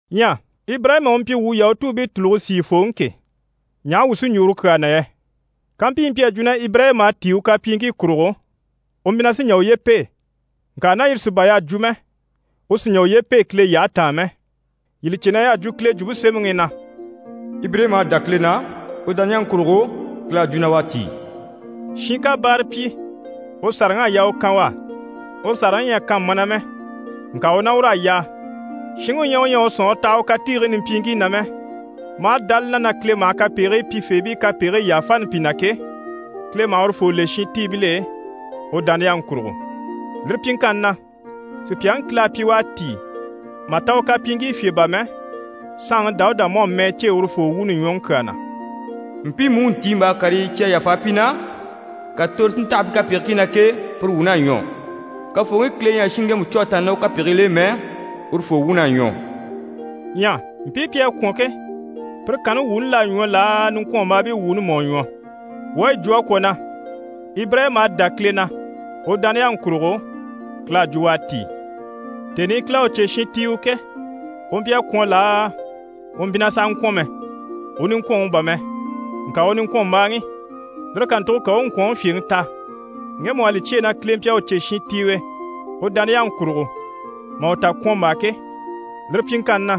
Ɲyɛ Ibirayima u mpyi wuu Yahutuubii tùluge sìifooŋi ke, ɲaha wuu sí n‑jwo uru kyaa na yɛ? Kampyi yi mpyi a jwo na Ibirayima à tíi u kapyiiŋkii kurugo, u mpyi na sí n‑jà uye pêe, ŋka ná yire sí bà y'à jwo mɛ, u sì n‑jà uye pêe Kile yyahe taan mɛ. Yii li cè na y'à jwo Kile Jwumpe Semɛŋi i na: «Ibirayima à dá Kile na, u dániyaŋi kurugo, Kile à jwo na u à tíi.» Shin ká báara pyi, u sàraŋ'à yaa u kan u á. Uru sàraŋi ɲyɛ a kan mana mɛ, ŋka u ná ur'à yaa. Shinŋi u ɲyɛ u ɲyɛ a u sɔ̀nŋɔre taha u katiigii nimpyiiŋkii na mɛ, maa dá li na na Kile maha kapegigii pyifeebii kapegigii yàfani pi na ke, Kile maha urufoo le shintiibil'e u dániyaŋi kurugo. Lire pyiŋkanni na, sùpyaŋi Kile à pyi u à tíi mà ta u kapyiiŋkii fye bà mɛ, saanŋi Dawuda mú à mɛɛ cêe urufoo wuuni ɲwɔŋi kyaa na: «Mpiimu u ntiimbaa karii cyi à yàfa pi na, ka toro si ntaha pi kapegigii na ke, pire wuun'à ɲwɔ. Kafooŋi Kile ɲyɛ a shinŋi ŋgemu cû a tàanna ná u kapegigil'e mɛ, urufoo wuun'à ɲwɔ.» Ɲyɛ mpii pi à kwɔ̀n ke, pire kanni wuuni l'à ɲwɔ laa, niŋkwɔnmbaabii wuuni mú à ɲwɔ? Wuu à yi jwo a kwɔ̀ na: «Ibirayima à dá Kile na, u dániyaŋi kurugo, Kile à jwo na u à tíi». Tèni i Kile à u cè shintiiwe ke, u mpyi a kwɔ̀n laa, u mpyi na sàha ŋkwɔ̀n mɛ? U niŋkwɔnŋi bà mɛ, ŋka u niŋkwɔnmbaaŋi. Lire kàntugo ka u u ŋkwɔ̀nŋi fyèŋi ta, ŋgemu u à li cyêe na Kile mpyi a u cè shintiiwe u dániyaŋi kurugo mà u ta kwɔ̀nmbaa ke. Lire pyiŋkanni na,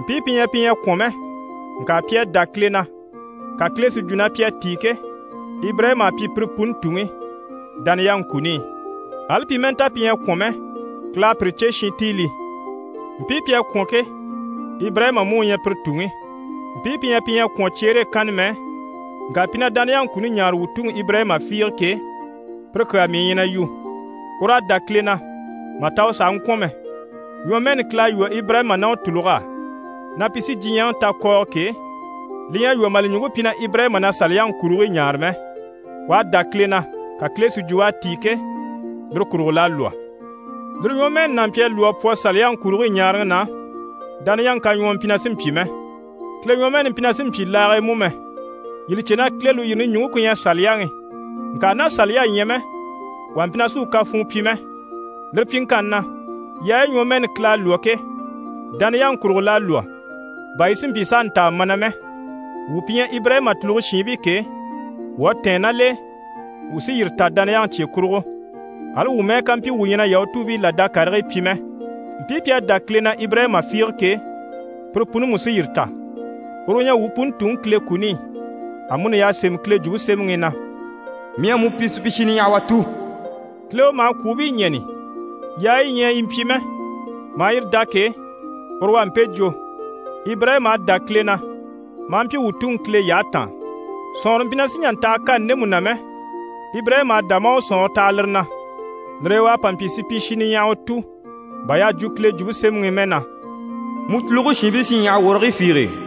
mpii pi ɲyɛ pi ɲyɛ a kwɔ̀n mɛ, ŋka pi à dá Kile na, ka Kile si jwo na pi à tíi ke, Ibirayima à pyi pire puni tuŋi dániyaŋi kuni i, ali pi mɛ́ɛ nta pi ɲyɛ a kwɔ̀n mɛ. Kile à pire cè shintiilii. Mpii pi à kwɔ̀n ke, Ibirayima mú u ɲyɛ pire tuŋi. Mpii pi ɲyɛ pi ɲyɛ a kwɔ̀n cyeere e kanna mɛ, ŋka pi na dániyaŋi kuni ɲaare wuu tuŋi Ibirayima fiige ke, pire kyaa mii ɲyɛ na yu. Ur'à dá Kile na mà ta u sàha ŋkwɔ̀n mɛ. Ɲwɔmɛɛni Kile à lwɔ́ Ibirayima ná u tùlug'á na pi sí diɲyɛŋi ta kɔɔgɔ ke, li ɲyɛ a lwɔ́ mà li ɲùŋke pyi na Ibirayima na Saliyaŋi kurigii ɲaare mɛ, u à dá Kile na ka Kile si jwo u à tíi ke, lire kurugo l'à lwɔ́. Lire ɲwɔmɛɛni n'a mpyi a lwɔ́ a pwɔ Saliyaŋi kurigii ɲaaraŋi na, dániyaŋi kaɲwɔɔ mpyi na sì n‑pyi mɛ, Kile ɲwɔmɛɛni mpyi na sì n‑pyi laage e mú mɛ. Yii li cè na Kile lùyirini ɲùŋke ku ɲyɛ Saliyaŋi, ŋka ná Saliya ɲyɛ mɛ, wà mpyi na sì u kafuun pyi mɛ. Lire pyiŋkanni na, yaayi ɲwɔmɛɛni Kile à lwɔ́ ke, dániyaŋi kurugo l'à lwɔ́, bà yi si mpyi s'a ntaa mana mɛ. Wuu pi ɲyɛ Ibirayima tùluge shiinbii ke, wuu à tɛ̀ɛn ná l'e, wuu sí yire ta dániyaŋi cye kurugo, ali wuu mɛ́ɛ ká mpyi wuu ɲyɛ na Yahutuubii làda karigii pyi mɛ. Mpii pi à dá Kile na Ibirayima fiige ke, pire puni mú sí yire ta. Uru u ɲyɛ wuu puni tuŋi Kile kuni i. Amuni y'à sémɛ Kile Jwumpe Semɛŋi i na: «Mii à mu pyi supyishi niɲyahawa tu.» Kile u maha kwùubii ɲɛ̀ni, yaayi yi ɲyɛ yi mpyi mɛ, maa yire dá ke, uru u à mpe jwo. Ibirayima à dá Kile na maa mpyi wuu tuŋi Kile yyahe taan. Sɔ̀nŋɔrɔ mpyi na sì n‑jà n‑taha kani ndemu na mɛ, Ibirayima à dá maa u sɔ̀nŋɔre taha lire na. Lire e u à pa mpyi supyishi niɲyahawa tu bà y'à jwo Kile Jwumpe Semɛŋi i mɛ na: «Mu tùluge shiinbii sí ɲyaha wɔrigii fiige.»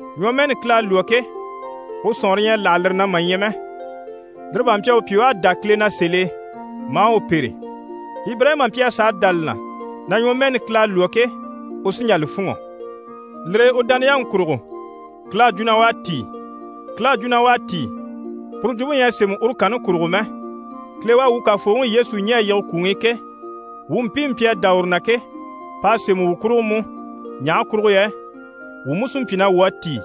Ɲwɔmɛɛni Kile à lwɔ́ ke, u sɔ̀nŋɔre ɲyɛ a láha lire na mà ɲya mɛ. Lire bá mpyi a u pyi u à dá Kile na sèl'e, maa u pêre. Ibirayima mpyi a sàa dá li na na ɲwɔmɛɛni Kile à lwɔ́ ke, u sí n‑jà li fûnŋɔ. Lire e u dániyaŋi kurugo, Kile à jwo na u à tíi. «Kile à jwo na u à tíi» puru jwumpe ɲyɛ a sémɛ uru kanni kurugo mɛ. Kile u à wuu Kafooŋi Yesu ɲɛ̀ a yige kwùŋi i ke, wuu mpiimu pi à dá uru na ke, p'à sémɛ wuu kurugo mú, ɲaha kurugo yɛ wuu mú sí n‑pyi na wuu à tíi.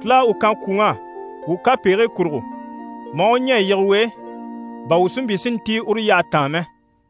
Kile à u kan kwùŋ'á wuu kapegigii kurugo, maa u ɲɛ̀ a yige u e, bà wuu si mpyi si ntíi uru yyahe taan mɛ.